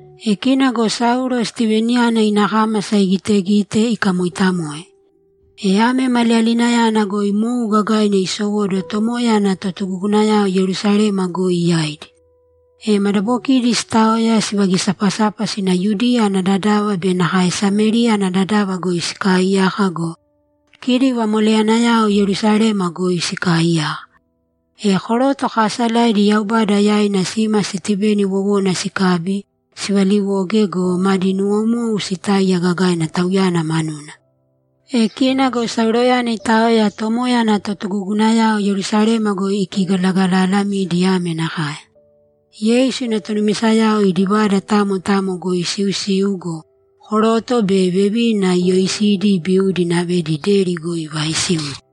E kina go Saulo Stiveniyana ina kámasa igitegite, ikamoitamoe. E ame maliyalinayana goi mou gagaina isowóduwo Tomoya ana totugugunayao Yerusalema goi yaidi. E madabokidi sitaoya, sivagisapasapa sina Yudiya ana dadava be nakae Samériya ana dadava goi sikaaiyaka go, kidi vamoleyanayao Yerusalema goi sikaaiyaka. E koroto kaasalaidi Yaubada yaina sima Stiveni wowona sikabi, sivaliwoge go, madi nuwomou sitáiya gagaina tauyana manuna. E kina go Sauloyana itaoya Tomoya ana totugugunayao Yerusalema goi ikigalagalalamidi ame nakae: Yeisu ina tonumisayao idi vada tamo tamo goi isiusiu go, koroto be nakae vevina iyoisidi ibiudi inavedi deri goi ivaaisiudi.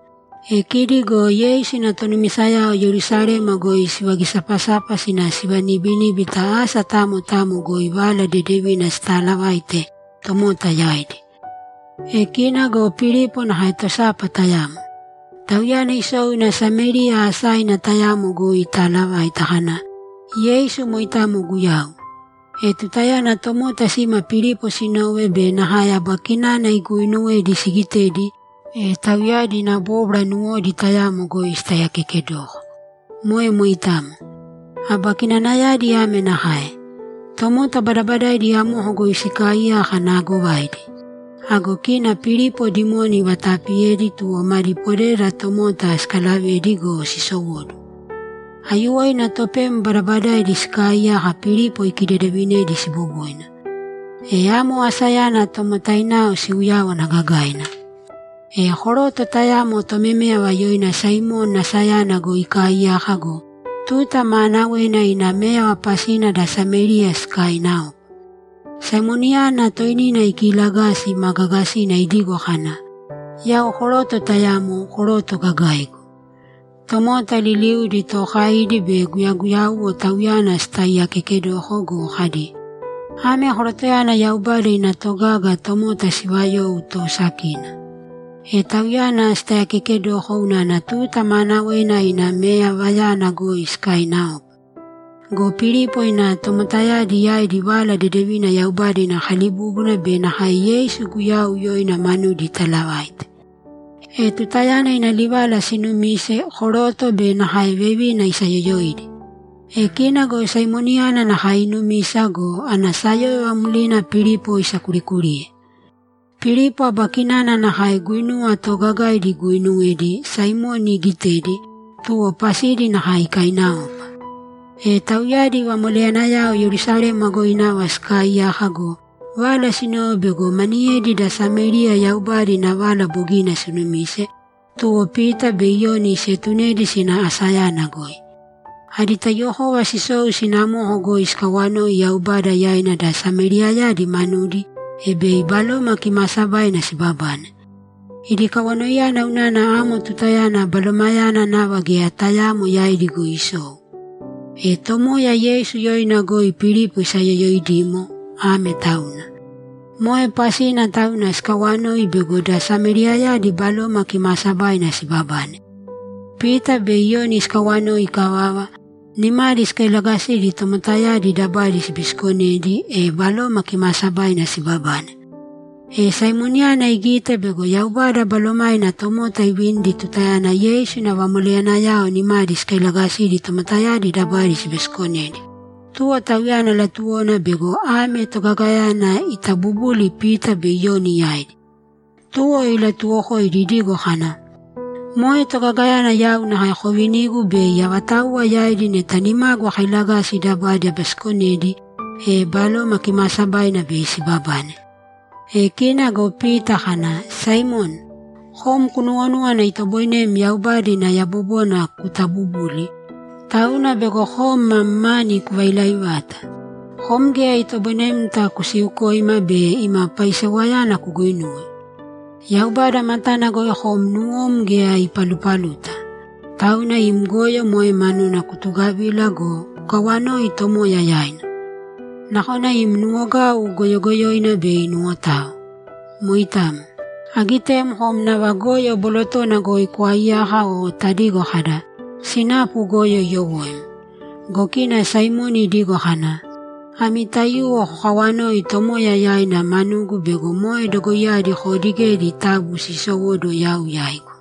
E kidi go Yeisu ina tonumisayao Yerusalema goi sivagisapasapa sina sivanibiníbita asa tamo tamo goi Vala Dedevina sitaalavaite tomota yaidi. E kina go Pilipo nakae tosapa tayamo. Tauyana isou ina Samériya asaina tayamo goi itaalavaita kana, ‘Yeisu moitamo Guyau.’ E tutayana tomota sima Pilipo sinove be nakae aba kinana iguuinuwedi sigitedi, e tauyadi ina bóbwara nuwodi tayamo goi sitaiyakekedoko. Moe moitamo. Aba kinanayadi ame nakae: Tomota badabadaidi amoko goi sikaaiyaka naagovaidi. Ago kina Pilipo dimoni ivatapiyedi, tuwo madi podeda tomota sikalavedi go, sisowóduwo. Aiyuwoina topem badabadaidi sikaaiyaka Pilipo ikidedevinedi siboboina. E amo asayana tomotainao siuyáwana gagaina! E koroto tayamo tomeméyava yoina Saimoni asayana goi ikaaiyaka go, tuta maanawena ina méyava pasina da Samériya sikaiinaopa. Saimoniyana toinina ikiilagasi ma gaagasina idigo kana, ‘Yau koroto tayamo, koroto gagaigu.’ Tomota liliudi, tookaidi be guyaguyauwo, tauyana sitaiyakekedoko go, kadi, ‘Ame korotoyana Yaubada ina togaga, tomota sivayou toosakina.’ E tauyana sitaiyakekedoko unana tuta maanawena ina meyavayana goi sikaiinaopa. Go Pilipo ina tomotayadi yaidi Vala Dedevina Yaubada ina kalibúbuna be nakae Yeisu Guyau yoina manudi italavaite. E tutayana ina livala sinumise, koroto be nakae vevina isayoyoidi. E kina go Saimoniyana nakae inumisa go, ana sayóyova mlina Pilipo isakurikuriye. Pilipo aba kinana nakae guinuwa toogagaidi iguuinuwedi, Saimoni igitedi, tuwo pasidi nakae ikaiinaopa. E tauyadi vamoleyanayao Yerusalema goi nava sikaaiyaka go, vala sinove bego maniyedi da Samériya Yaubada ina vala bogina sinumise, tuwo Pita be Iyoni sietunedi sina asayana goi. Adi taiyuwokova sisou sina amoko goi sikawanoi Yaubada yaina da Sameriyayadi manudi, e bei Baloma Kimaasabaina sibabane. Idi kawanoiyana unana amo tutayana Balomayana nava geya tayaamo yaidi goi isou. E Tomoya Yeisu yoina goi Pilipo isayoyoidimo, ame tauna. Moe pasina tauna sikawanoi bego da Sameriyayadi Baloma Kimaasabaina sibabane. Pita be Iyoni sikawanoi ikavava, nimadi sikailagasidi tomotayadi dabadi sibisikonedi, e Baloma Kimaasabaina sibabane. E Saimoniyana igite bego Yaubada Balomaina tomota ivinidi tutayana Yeisu ina vamoleyanayao nimadi sikailagasidi tomotayadi dabadi sibisikonedi, tuwo tauyana latuwona bego ame togagayana itabubuli Pita be Iyoni yaidi. Tuwo ilatuwokoidi idigo kana, ‘Moe togagayana yau nakae kovinīgu bei avatauwa yaidi neta nimagu akailagasi dabadi abisikonedi, e Baloma Kimaasabaina bei sibabane.’ E kina go Pita kana, ‘Saimoni, kom kunuwonúwana itoboinem Yaubada ina yabobona kutabubuli, tauna bego kom mam mani kuvailai vata! Kom geya itoboinemta kusiukoima be ima paisewayana kuguinuwe. Yaubada matana goi kom nuwom geya ipalupaluta. Tauna im goyo moe manuna kutugavīla go, kukawanōi Tomoya yaina. Nakona im nuwogau goyogoyoina bei inuwotao. Moitamo. Agitem kom nava goyo bolotona goi kwaiyaka o tadigo kada, “Sinapu goyo iyowóim.”’ Go kina Saimoni idigo kana, ‘Ami taiyuwo kokawanōi Tomoya yaina manugu bego moe dogoiyadi koodigedi taabu siisowōduwo yau yaigu.’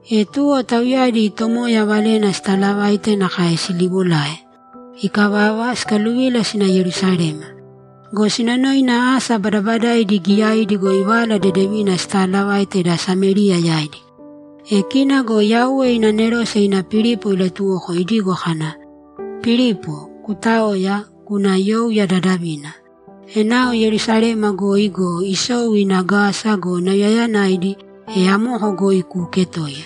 E tuwo, tauyadi Tomoya valena sitalavaite nakae siliwolae. Ikavava, sikaluvila sina Yerusalema. Go sinonoina asa badabadaidi giyaidi goi Vala Dedevina sitaalavaite da Samériya yaidi. E kina go Yauwe ina anerose ina Pilipo ilatuwoko idigo kana, ‘Pilipo, kutāoya, kūna youya dadavina. Enao Yerusalema goi go, isou ina Gasa go, nauyayanaidi, e amoko goi kuuketōiya.’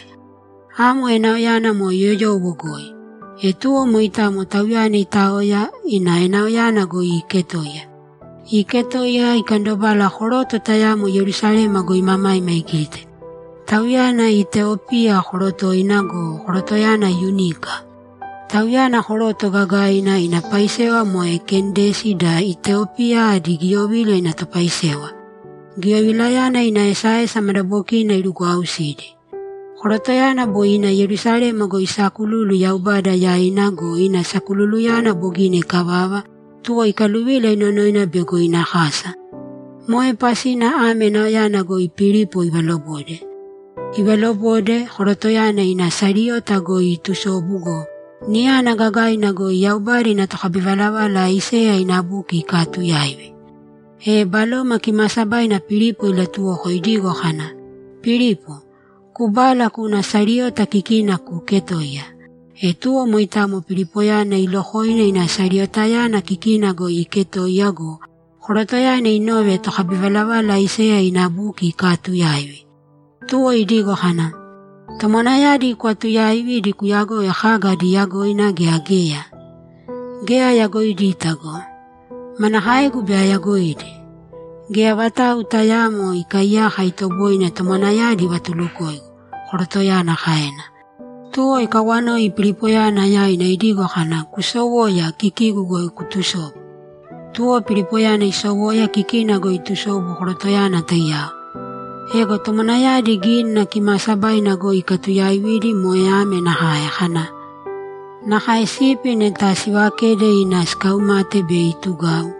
Amo enaoyana moe yoyowo goi. E tuwo moitamo tauyana itaoya, ina enaoyana goi iiketoiya. Iiketoiya, ikandobala koroto tayamo Yerusalema goi imamaima igite. Tauyana Iteopia korotoina go, korotoyana yunika. Tauyana koroto gagaina, ina paisewa moe Kendesi da Iteopia adi giyovila ina topaisewa; giyovilayana ina esaesa madabokina irugwausidi. Korotoyana boi ina Yerusalema goi isakululu Yaubada yaina go, ina sakululuyana bogina ikavava, tuwo ikaluvila inonoina bego ina kasa. Moe pasina ame enaoyana goi Pilipo ivalobode. Ivalobode, korotoyana ina sariyota goi iitusobu go, niyana gagaina goi Yaubada ina tokabivalavala Aiseya ina buki ikaatuyaivi. E Baloma Kimaasabaina Pilipo ilatuwoko idigo kana, ‘Pilipo, kubāla kūna sariyota kikina kuuketōiya.’ E tuwo moitamo Pilipoyana ilokoina ina sariyotayana kikina goi iiketoiya go, korotoyana inove tokabivalavala Aiseya ina buki ikaatuyaivi. Tuwo idigo kana, ‘Tomwanayadi kwaatuyaividi kuyagoi kaga adi yagoina gea geya?’ ‘Geya ayagoidita go! Manakaegu bei ayagoidi? Geya vatau tayaamo ikaaiyaka itoboine tomwanayadi ivatulukoigu’, korotoyana kaena. Tuwo ikawanoi Pilipoyana yaina idigo kana, ‘Kusowōya, kikigu goi kutusōbu.’ Tuwo Pilipoyana isowoya kikina goi itusobu korotoyana taiyao. Ego tomwanayadi Gínina Kimaasabaina goi ikaatuyaividi moe ame nakae kana, ‘Nakae sipi neta sivakede ina sikaumate bei itugau,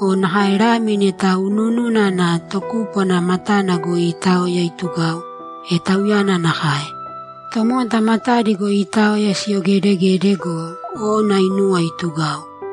o nakae lami neta unuununa ana tokúpwana matana goi iitaoya itugau, e Tauyana nakae. Tomota matadi goi iitaoya siyogedegede go, ona inuwa itugau.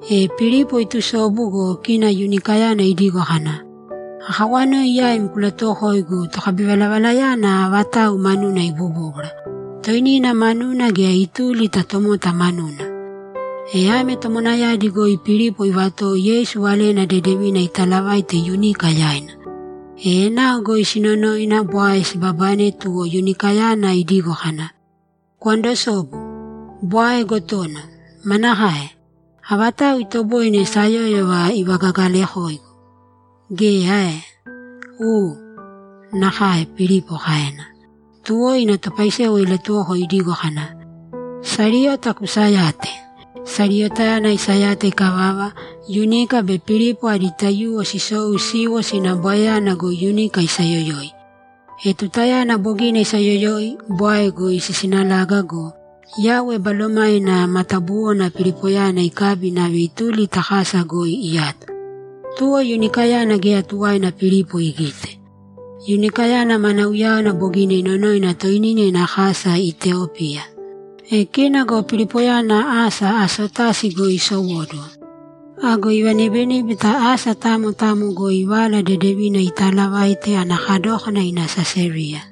E Pilipo itusobu go, kina yunikayana idigo kana, ‘Akawanoi yaim kulatuwokoigu, tokabivalavalayana avatau manuna ibobóbwara, toinina manuna gea ituli ta tomota manuna?’ E ame tomwanayadi goi Pilipo ivatowo Yeisu Valena Dedevina italavaite yunika yaina. E enao goi sinonoina, bwae sibabane, tuwo yunikayana idigo kana, ‘Kwandosōbu. Bwae gotono! Manakae? Avatau itoboine sayóyova ivagagalakoigu? Geya ae?’ ‘U. Nakae’, Pilipo kaena. Tuwo ina topaisewa ilatuwoko idigo kana, ‘Sariyota kusayāte.’ Sariyotayana isayata ikavava, yunika be Pilipo adi taiyuwo sisou siiwo sina bwaeyana goi yunika isayoyoi. E tutayana bogina isayoyoi, bwae goi sisinalaga go, Yauwe Balomaina matabuwona Pilipoyana ikabi inave ituli ta kasa goi iyato. Tuwo yunikayana geya tuwaina Pilipo igite. Yunikayana mana uyáwana bogina inonoina toinina ina kasa Iteopia. E kina go Pilipoyana asa Asotasi goi isowóduwo. Ago ivanibiníbita asa tamo tamo goi Vala Dedevina itaalavaite ana kadókana ina Sesariya.